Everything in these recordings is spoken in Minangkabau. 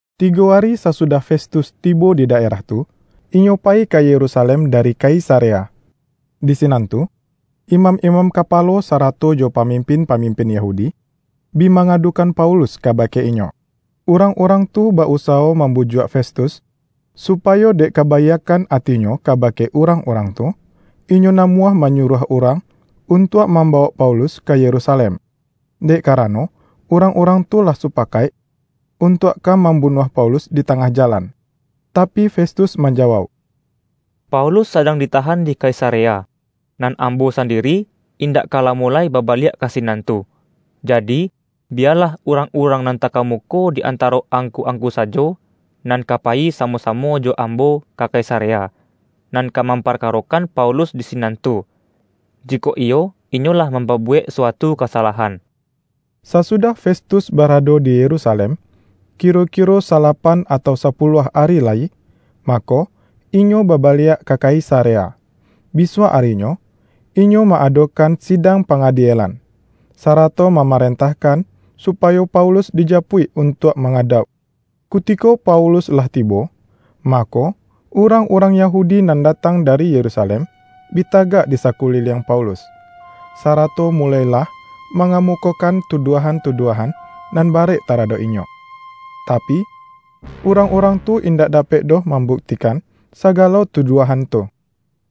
Tigo ari sasudah Festus tibo di daerah tu, inyo payi ka Yerusalem dari Kaisarea. Di sinan tu, imam-imam kapalo sarato jo pamimpin-pamimpin Yahudi, bi mangadukan Paulus kabake inyo. Urang-urang tu ba-usawo mambujuak Festus, supayo dek kabaiakkan atinyo kabake urang-urang tu, inyo namuah manyuruah urang untuak mambawok Paulus ka Yerusalem; dek karano urang-urang tu lah supakaik, untuak ka mambunuah Paulus di tangah jalan. Tapi Festus manjawauk,”Paulus sadang ditahan di Kaisarea; nan ambo sandiri, indak ka lamo lai babaliak ka sinan tu. Jadi, biyalah urang-urang nan takamuko di antaro angku-angku sajo, nan ka payi samo-samo jo ambo ka Kaisarea, nan ka mamparkarokan Paulus di sinan tu, jikok iyo inyo lah mampabuwek suatu kasalahan.” Sasudah Festus barado di Yerusalem, kiro-kiro salapan atau sapuluah ari lai, mako, inyo babaliak ka Kaisarea. Bisuak arinyo, inyo ma-adokan sidang pangadielan, sarato mamarentahkan supayo Paulus dijapuik untuak mangadauk. Kutiko Paulus lah tibo, mako, urang-urang Yahudi nan datang dari Yerusalem, bi tagak di sakuliliang Paulus, sarato muloilah mangamukokan tuduahan-tuduahan nan barek taradok inyo. Tapi, urang-urang tu indak dapek doh mambuktikan sagalo tuduahan tu.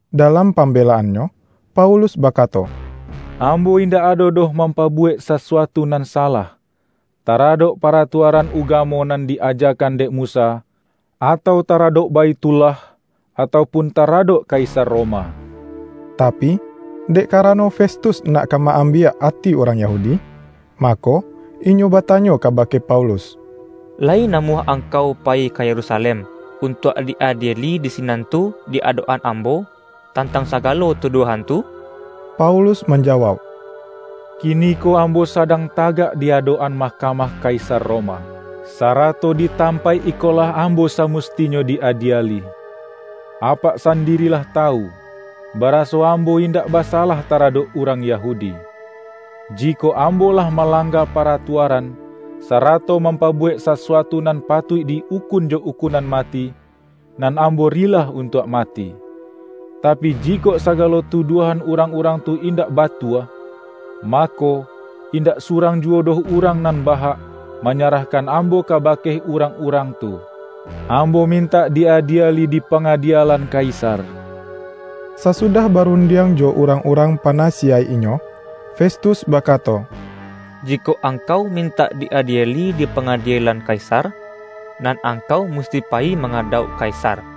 Dalam pambelaannyo Paulus bakato,”Ambo indak ado doh mampabuwek sasuatu nan salah, taradok paratuaran ugamo nan di-ajakan dek Musa, atau taradok Baithullah, atau pun taradok Kaisar Roma.” Tapi, dek karano Festus nak ka ma-ambiak ati urang Yahudi. Mako, inyo batanyo kabake Paulus,”Layi namuah angkau payi ka Yerusalem, untuak di-adieli di sinan tu di adok-an ambo, tantang sagalo tuduahan tu?” Paulus manjawauk,”Kiniko ambo sadang tagak di adok-an mahkamah Kaisar Roma; sarato di tampaik ikolah ambo samustinyo di-adieli. Apak sandiri lah tawu, baraso ambo indak basalah taradok urang Yahudi. Jikok ambo lah malangga paratuaran, sarato mampabuwek sasuatu nan patuik di-ukun jo ukunan mati, nan ambo rilah untuak mati. Tapi, jikok sagalo tuduahan urang-urang tu indak batua, mako, indak surang juwo doh urang nan bahak, manyarahkan ambo kabake urang-urang tu. Ambo mintak di-adieli dipangadielan Kaisar!” Sasudah barundiang jo urang-urang panasiyaik inyo, Festus bakato,”Jikok angkau mintak di-adieli dipangadielan Kaisar, nan angkau musti payi mangadauk Kaisar.”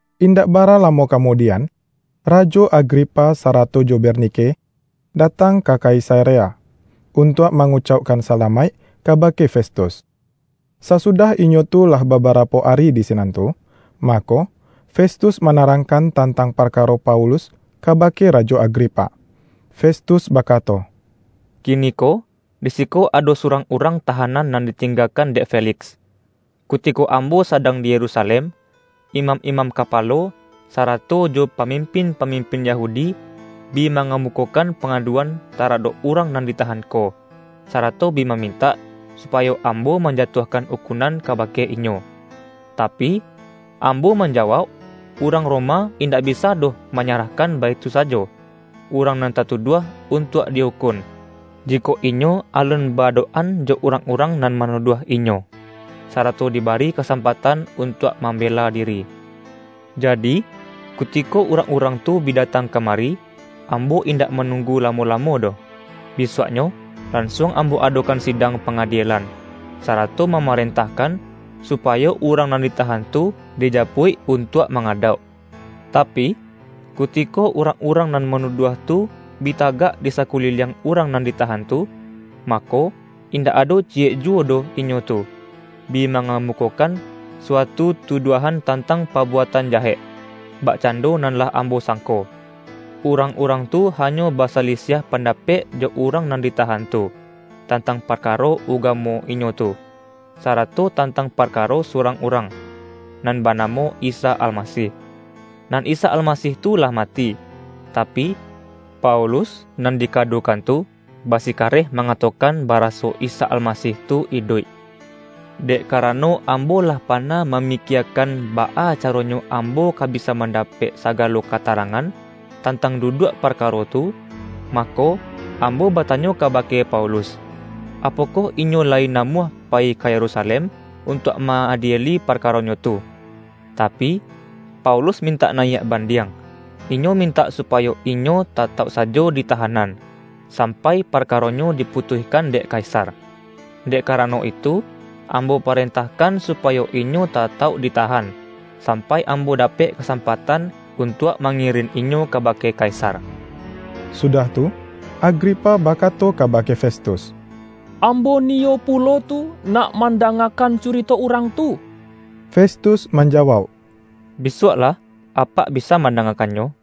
Indak bara lamo kamudian, Rajo Agripa sarato jo Bernike datang ka Kaisarea, untuak mangucaukkan salamaik kabake Festus. Sasudah inyo tu lah babarapo ari di sinan tu, mako, Festus manarangkan tantang parkaro Paulus kabake Rajo Agripa. Festus bakato,”Kiniko di siko ado surang urang tahanan nan ditinggakan dek Feliks. Kutiko ambo sadang di Yerusalem, imam-imam kapalo, sarato jo pamimpin-pamimpin Yahudi, bi mangamukokan pangaduan taradok urang nan ditahan ko, sarato bi mamintak, supayo ambo manjatuahkan ukunan kabake inyo. Tapi, ambo manjawauk, urang Roma indak bisa doh manyarahkan baitu sajo, urang nan tatuduah untuak di-ukun, jikok inyo alun ba-adok-an jo urang-urang nan manuduah inyo, sarato dibari kasampatan untuak mambela diri. Jadi, kutiko urang-urang tu bi datang ka mari, ambo indak manunggu lamo-lamo doh. Bisuaknyo lansuang ambo adokan sidang pangadielan, sarato mamarentahkan, supayo urang nan ditahan tu dijapuik untuak mangadauk. Tapi, kutiko urang-urang nan manuduah tu, bi tagak di sakuliliang urang nan ditahan tu, mako, indak ado ciyek juwo doh inyo tu, bi mangamukokan suatu tuduahan tantang pabuatan jahek, bakcando nan lah ambo sangko. Urang-urang tu hanyo basalisiah pandapek jo urang nan ditahan tu, tantang parkaro ugamo inyo tu, sarato tantang parkaro surang urang, nan banamo Isa Almasih. Nan Isa Almasih tu lah mati, tapi, Paulus nan dikadukan tu, basikareh mangatokan baraso Isa Almasih tu iduik. Dek karano ambo lah pana mamikiekan, baa caronyo ambo ka bisa mandapek sagalo katarangan, tantang duduak parkaro tu, mako, ambo batanyo kabake Paulus, apokoh inyo layi namuah payi ka Yerusalem, untuak ma-adieli parkaronyo tu. Tapi, Paulus mintak nayiak bandiang; inyo mintak supayo inyo tatauk sajo di tahanan, sampai parkaronyo diputuihkan dek Kaisar. Dek karano itu, ambo parentahkan supayo inyo tatauk ditahan, sampai ambo dapek kasampatan untuak mangirin inyo kabake Kaisar.” Sudah tu, Agripa bakato kabake Festus,”Ambo niyo pulo tu nak mandangakan curito urang tu.” Festus manjawauk,”Bisuaklah, apak bisa mandangakannyo.”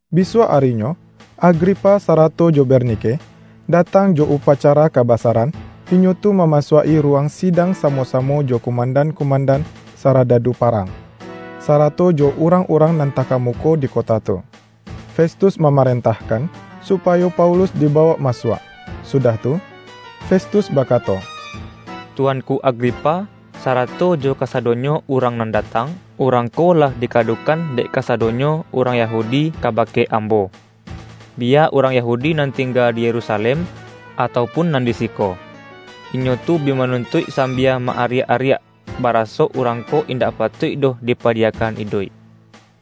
Bisuak arinyo, Agripa sarato jo Bernike, datang jo upacara kabasaran. Inyo tu mamasuak-i ruwang sidang samo-samo jo kumandan-kumandan saradadu parang, sarato jo urang-urang nan takamuko di kota tu. Festus mamarentahkan, supayo Paulus dibawok masuak. Sudah tu, Festus bakato,”Tuanku Agripa, sarato jo kasadonyo urang nan datang! Urang ko lah dikadukan dek kasadonyo urang Yahudi kabake ambo, biya urang Yahudi nan tingga di Yerusalem, atau pun nan di siko. Inyo tu bi manuntuik sambia ma-ariak-ariak, baraso urang ko indak patuik doh dipadiyakan iduik.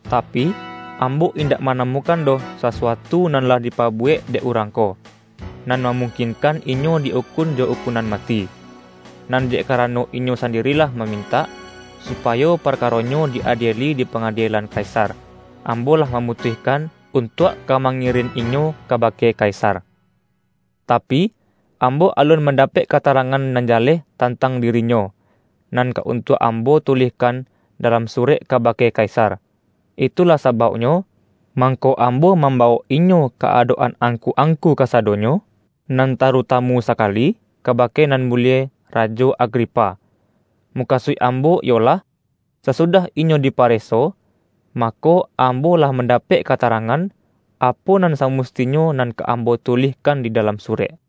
Tapi, ambo indak manamukan doh sasuatu nan lah dipabuwek dek urang ko, nan mamungkinkan inyo di-ukun jo ukunan mati. Nan dek karano inyo sandiri lah mamintak, supayo parkaronyo di-adieli dipangadielan Kaisar, ambo lah mamutuihkan untuak ka mangirin inyo kabake Kaisar. Tapi, ambo alun mandapek katarangan nan jaleh tantang dirinyo, nan ka untuak ambo tulihkan dalam surek kabake Kaisar. Itulah sabauknyo, mangko ambo mambawok inyo ka adok-an angku-angku kasadonyo, nan tarutamu sakali, kabake nan mulie, Rajo Agripa! Mukasuik ambo iyolah, sasudah inyo dipareso, mako, ambo lah mandapek katarangan, apo nan samustinyo nan ka ambo tulihkan di dalam surek.